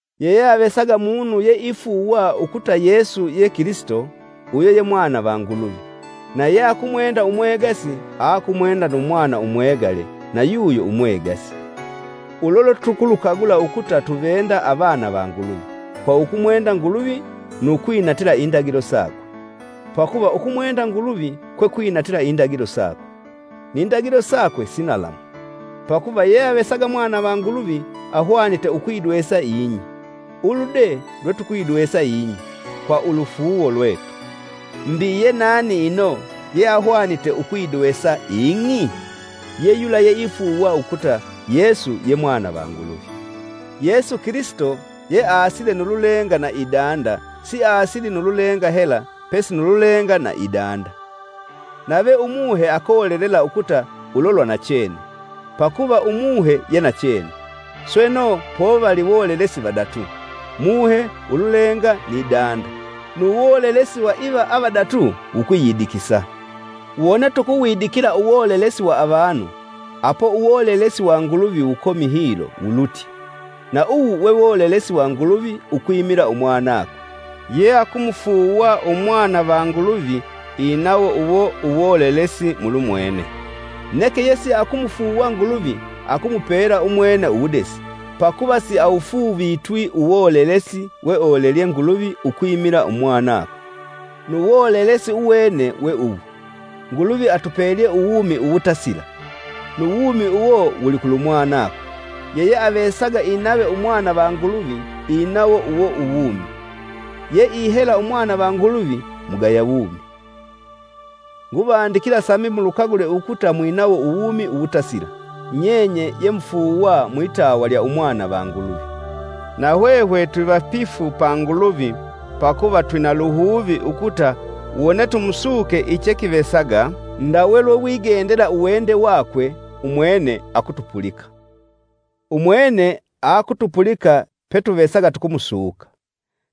Yeyeavesaga munu yeifuuwa ukuta Yesu ye Kilisito, uyo ye mwana va Nguluvi; na yeakumwenda umwegasi aakumwenda nu mwana umwegale na yuyo umwegasi. Ulo lwetukulukagula ukuta tuvenda avana va Nguluvi: kwa ukumwenda Nguluvi nu kwinatila indagilo sakwe; pakuva ukumwenda Nguluvi kwe kwinatila indagilo sakwe. Ni ndagilo sakwe si nalamu, pakuva yeyeavesaga mwana va Nguluvi ahwanite ukuyidwesa ing'i ulu de lwetukuyidwesa ing'i: kwa ulufuuwo lwetu. Mbi yenani ino, yeahwanite ukuyidwesa ing'i? Ye yula yeifuuwa ukuta Yesu ye Mwana va Nguluvi. Yesu Kilisito yeaasile nu lulenga na idanda, siasili nu lulenga hela pesi nu lulenga na idanda. Nave Umuhe akolelela ukuta ulo lwa nachene, pakuva Umuhe ye nachene. Sweno, povali wolelesi vadatu, Muhe, ululenga ni danda nu wolelesi wa iva avadatu wukwiyidikisa. Wone tukuwidikila uwolelesi wa avanu, apo uwolelesi wa Nguluvi wukomi hilo wulutye; na uwu we wa Nguluvi ukwimila Umwanakwe. Yeakumufuuwa mwana va Nguluvi inawo uwo uwolelesi mulumwene; neke yesiakumufuuwa Nguluvi, akumupela umwene uwudesi, pakuva siawufuuvitwi uwolelesi weolelelye Nguluvi ukwimila Umwanakwe. Nu wolelesi uwene we uwu: Nguluvi atupelye uwumi uwutasila nu wumi uwo wuli Kulumutwa. Yeyeavesaga inave Umwana va Nguluvi inawo uwo uwumi; yeihela u Mwana va Nguluvi, mugaya wumi. Nguvandikila sambi mulukagule ukuta mwinawo uwumi uwutasila nyenye yemufuuwa mwitawa lya Umwana va Nguluvi. Na hwehwe twivapifu pa Nguluvi pakuva twina luhuvi ukuta wone tumusuke ichekivesaga ndawe lwewigendela uwende wakwe, umwene akutupulika. Umwene aakutupulika petuvesaga tukumusuka;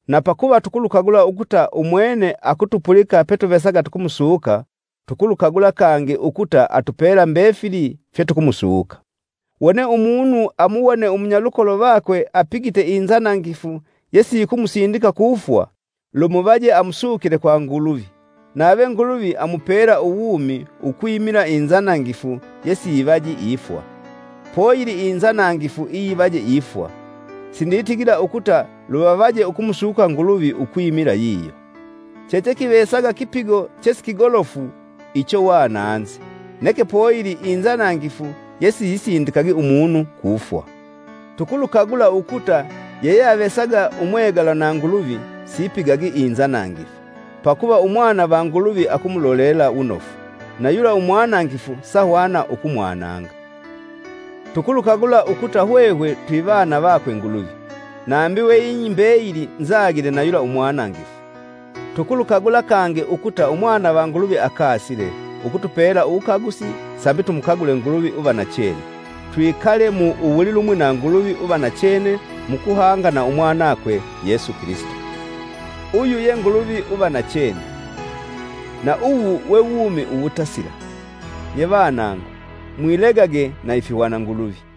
na pakuva tukulukagula ukuta umwene akutupulika petuvesaga tukumusuka, tukulukagula kangi ukuta atupela mbefili fyetukumusuka. Wone umunu amuwone umunyalukolo vakwe apigite inzanangifu yesiyikumusindika kufwa, lumuvaje amusukile kwa Nguluvi, nave Nguluvi amupela uwumi. Ukwimila inzanangifu yesiyivaji ifwa. Poyili inzanangifu iyivaje ifwa, sinditigila ukuta luvavaje ukumusuka Nguluvi ukwimila yiyo. Chechekivesaga kipigo chesikigolofu icho wananzi, neke poyili inzanangifu yesiyisindikagi umunu kufwa. Tukulukagula ukuta yeyeavesaga umwegalwa na Nguluvi sipigagi inzanangifu, pakuva Umwana va Nguluvi akumulolela wunofu, nayula umwanangifu sahwana ukumwananga. Tukulukagula ukuta hwehwe twivanu vakwe Nguluvi nambi we ing'i mbeyili nzagile na yula Umwanangifu. Tukulukagula kangi ukuta Umwana va Nguluvi akasile, ukutupela uwukagusi sambi tumukagule Nguluvi uva nachene; twikale mu uwulilumwi na Nguluvi uva nachene mukuhanga na Umwanakwe, Yesu Kilisito. Uyu ye Nguluvi uva nachene, na uwu we wumi uwutasila. Nye vanangu, mwilegage na ifihwananguluvi!